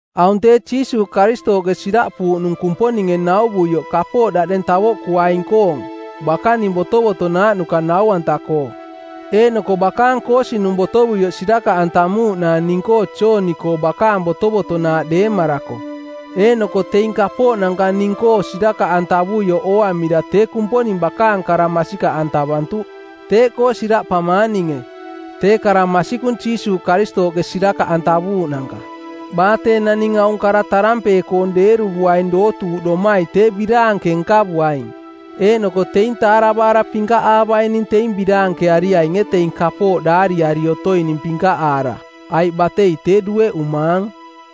Aung tee Jiisuuꞌ Karistooꞌke siraꞌpuuꞌnung Kumponinge nauvuioꞌ kapooꞌ daꞌdeng tavoꞌkuaing-koong bakaning botovotonaaꞌnuka nau-anta-koo. Eeꞌnoko bakaang koosinung˜ botovuioꞌ sirakaꞌantamuuꞌnaang ning-koo Jooni-koo bakaang botovotonaaꞌ deemarako. Eeꞌnoko teing kapooꞌnanka ning-koo sirakaꞌantavuioꞌ ooamira tee Kumponing bakaang kara masikaꞌantavantuꞌ. Teeꞌkoo siraꞌpamaang ninge, tee kara masikung Jiisuuꞌ Karistooꞌke sirakaꞌantavuuꞌnanka. Baa tee naning aung kara tarampee-koong˜ deeruvuaing dootuuꞌdomai tee biraanke nkavuaing, eeꞌnoko teing taaravaara pinkaꞌaavaining teing biraankeariainge teing kapooꞌ daariari otoining pinkaꞌaara, aiꞌ batei tee dueꞌumaang.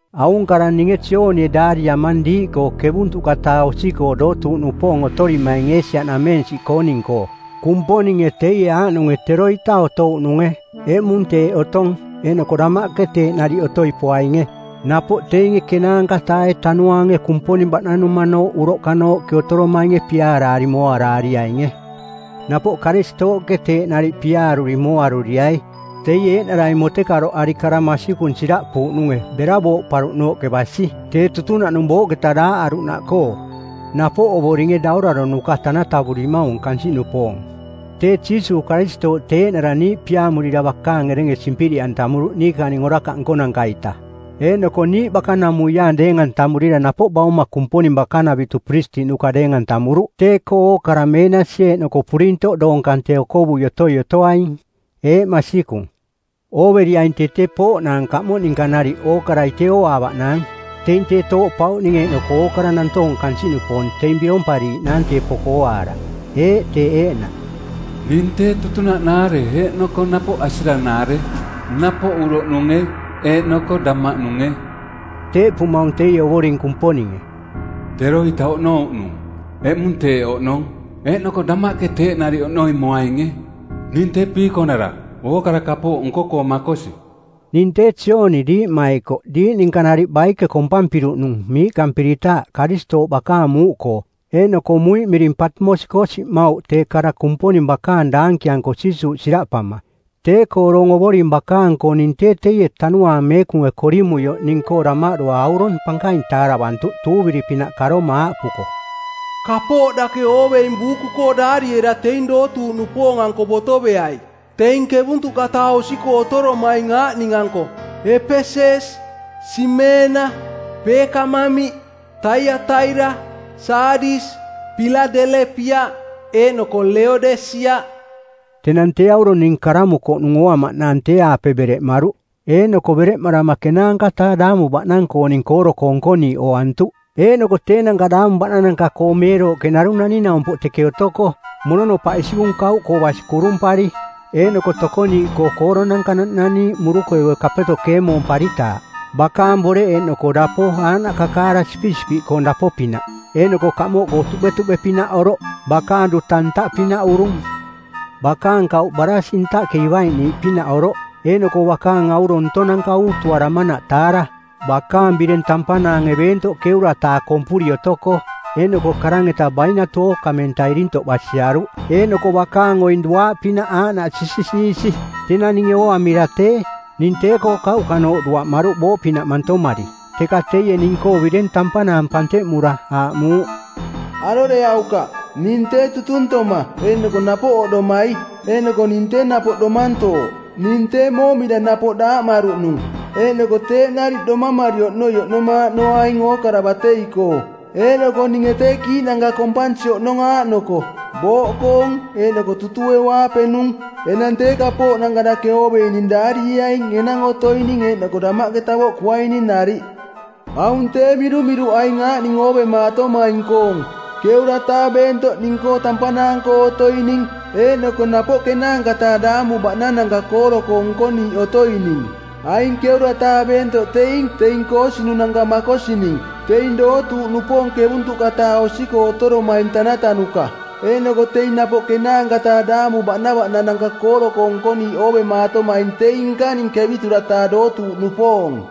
Aung kara ninge Joonie daariamang diiꞌkoo ˜kevuntuꞌka-taa osi-koo dootuuꞌnupoong otorimaing Eesia-nameensiꞌkooning-koo. Kumponinge teie aaꞌnunge, teroita otouꞌnunge, eꞌmung teeꞌ otong, eeꞌnoko damaꞌke teeꞌ nariꞌ otoi poainge, teie piaaruri mooaruriaing. Napoꞌ teinge ˜kenaanka-taae Tanuaange Kumponing baꞌnanumanooꞌ uroꞌkanooꞌke otoromainge piaaraari mooaraariainge. Napoꞌ Karistooꞌke teeꞌ nariꞌ piaaruri mooaruriai. Teie eeꞌnarai motekaroꞌari kara masikung siraꞌpuuꞌnunge bera booꞌparuꞌnooꞌke basi. Tee tutunaꞌnung booꞌketa daaꞌaruꞌnaꞌkoo, napoꞌ Ovoringe dauraronuka tanatavurimaung kansiꞌnupoong. Tee Jiisuuꞌ Karistooꞌ tee eeꞌnara niiꞌ piaamurira bakaang erenge simpiriꞌantamuruꞌ niikaning orakaꞌ nkonanka-ita. Eeꞌnoko niiꞌ bakanamuiaang deeng-antamurira napoꞌ Bauma Kumponing bakanavitu pirisitiꞌnuka deeng-antamuruꞌ tee-koo ookara meenasi eeꞌnoko purintoꞌ doong kante okovui otoi otoaing. Eeꞌ, masikung. Ooveriaing tee tee pooꞌnaang kaꞌmoꞌ ninka nariꞌ ookarai tee ooaavaꞌnaang. Teing tee tooꞌpauꞌning eeꞌnoko ookara nantoong kansiꞌnupoong teing birompariiꞌnaang tee poko ooaara. Eeꞌ, teeꞌ eeꞌnaꞌ. “Ning tee tutunaꞌnaare eeꞌnoko napoꞌ asiranaare, napoꞌ uroꞌnunge eeꞌnoko damaꞌnunge.” Teeꞌpumaung teie Ovoring Kumponinge. “Teroita oꞌnouꞌnung, eꞌmung teeꞌ oꞌnong, eeꞌnoko damaꞌke teeꞌ nariꞌ oꞌnoi moainge. Ning tee Piikonara, ookara kapooꞌ nko-koo makosi.” Ning tee Jooni diiꞌmaikoꞌ diiꞌ ninka nariꞌ baike kompampiruꞌnung miiꞌkampiritaaꞌ Karistooꞌ bakaang muuꞌkoo. Eeꞌnoko muiꞌ miring Patimos-koo siꞌmauꞌ tee kara Kumponing bakaang daankianko Jiisuuꞌ siraꞌpama. Tee-koo doong Ovoring bakaang-koo ning tee teie Tanuaang Meekunge korimuioꞌ ning-koo damaꞌdua aurong pankaing taaravantuꞌ tuuviri-pinaꞌ karoma aaꞌpuko, “Kapooꞌ dake ooveing buuku-koo daariera teing dootuuꞌnupoong-anko botoveai, teing ˜kevuntuꞌka-taa osi-koo otoromaing aaꞌning-anko: Epeses, Simeena, Peekamamiꞌ, Taiataira, Saadis, Piladelepiaꞌ, eeꞌnoko Leodesiaꞌ.” Tenang tee aurong ning karamukoꞌnung ooamaꞌnaang tee-aape bereꞌmaruꞌ, eeꞌnoko bereꞌmarama ˜kenaanka-taa daamu baꞌnang-kooning kooro-koo nkoniiꞌ ooantuꞌ. Eeꞌnoko teenanka daamu baꞌnananka-koo meerooꞌke narung naning-naumpoꞌ teke otoko, mononopaꞌ isikung kauꞌkoo basi kurumpari, eeꞌnoko tokoniiꞌkoo kooronanka naꞌnaniiꞌ murukeue kapeto keemoomparitaaꞌ. Bakaang boreꞌ eeꞌnoko dapo aaꞌnaꞌ kakaara sipisipiꞌkoong dapo-pinaꞌ eeꞌnoko kaꞌmoꞌkoo tuꞌbetuꞌbe-pinaꞌ oroꞌ. Bakaang duta ntaꞌpinaꞌ urung. Bakaang kauꞌ baraasi˜ ntaꞌke ivaiꞌniiꞌpinaꞌ oroꞌ, eeꞌnoko bakaang aurong ntonanka uutuaramanaꞌ taara. Bakaang bireng tampanaange beentoꞌ ˜keura-taa kompuri otokoꞌ, eeꞌnoko karang-eta bainatu ookamenta irintoꞌ basiaruꞌ, eeꞌnoko bakaang oing duaaꞌpinaꞌ aaꞌnaꞌ sisisiisi. Tenang ninge ooamira tee, ning tee-koo kauꞌkanooꞌ duaꞌmaruꞌ booꞌpinaꞌ mantomari. Teka teie ning-koo bireng tampanaang panteꞌmura, aaꞌmuuꞌ, “Aroreaukaꞌ. Ning tee tutuntoma eeꞌnoko napoꞌ oꞌdomai. Eeꞌnoko ning tee napoꞌ Domantooꞌ. Ning tee moomira napoꞌ daaꞌmaruꞌnung. Eeꞌnoko teeꞌ nariꞌ domamari oꞌnoi oꞌnomaaꞌnoaing ookara batei-koo. Eeꞌnoko ninge tee kiiꞌnanka kompansi oꞌnong aaꞌnoko: booꞌkoong eeꞌnoko tutueu-aapenung. Enang tee kapooꞌnanka dake ooveining daarieaing enang otoining eeꞌnoko damaꞌke tavoꞌkuaining nariꞌ. Aung tee mirumiruꞌ aing aaꞌning oovemaatomaing-koong: ˜keura-taa beentoꞌ ning-koo tampanaang-koo otoining eeꞌnoko napoꞌ ˜kenaanka-taa daamu baꞌnananka kooro-koo nkoniiꞌ otoining. Aing ˜keura-taa beentoꞌ teing teing koosinunanka makosining, teing dootuuꞌnupoong ˜kevuntuꞌka-taa osi-koo otoromaing tanatanuka. Eeꞌnoko teing napoꞌ ˜kenaanka-taa daamu baꞌnananka kooro-koo nkoniiꞌ oovemaatomaing teing nkaning ˜kevitura-taa dootuuꞌnupoong.”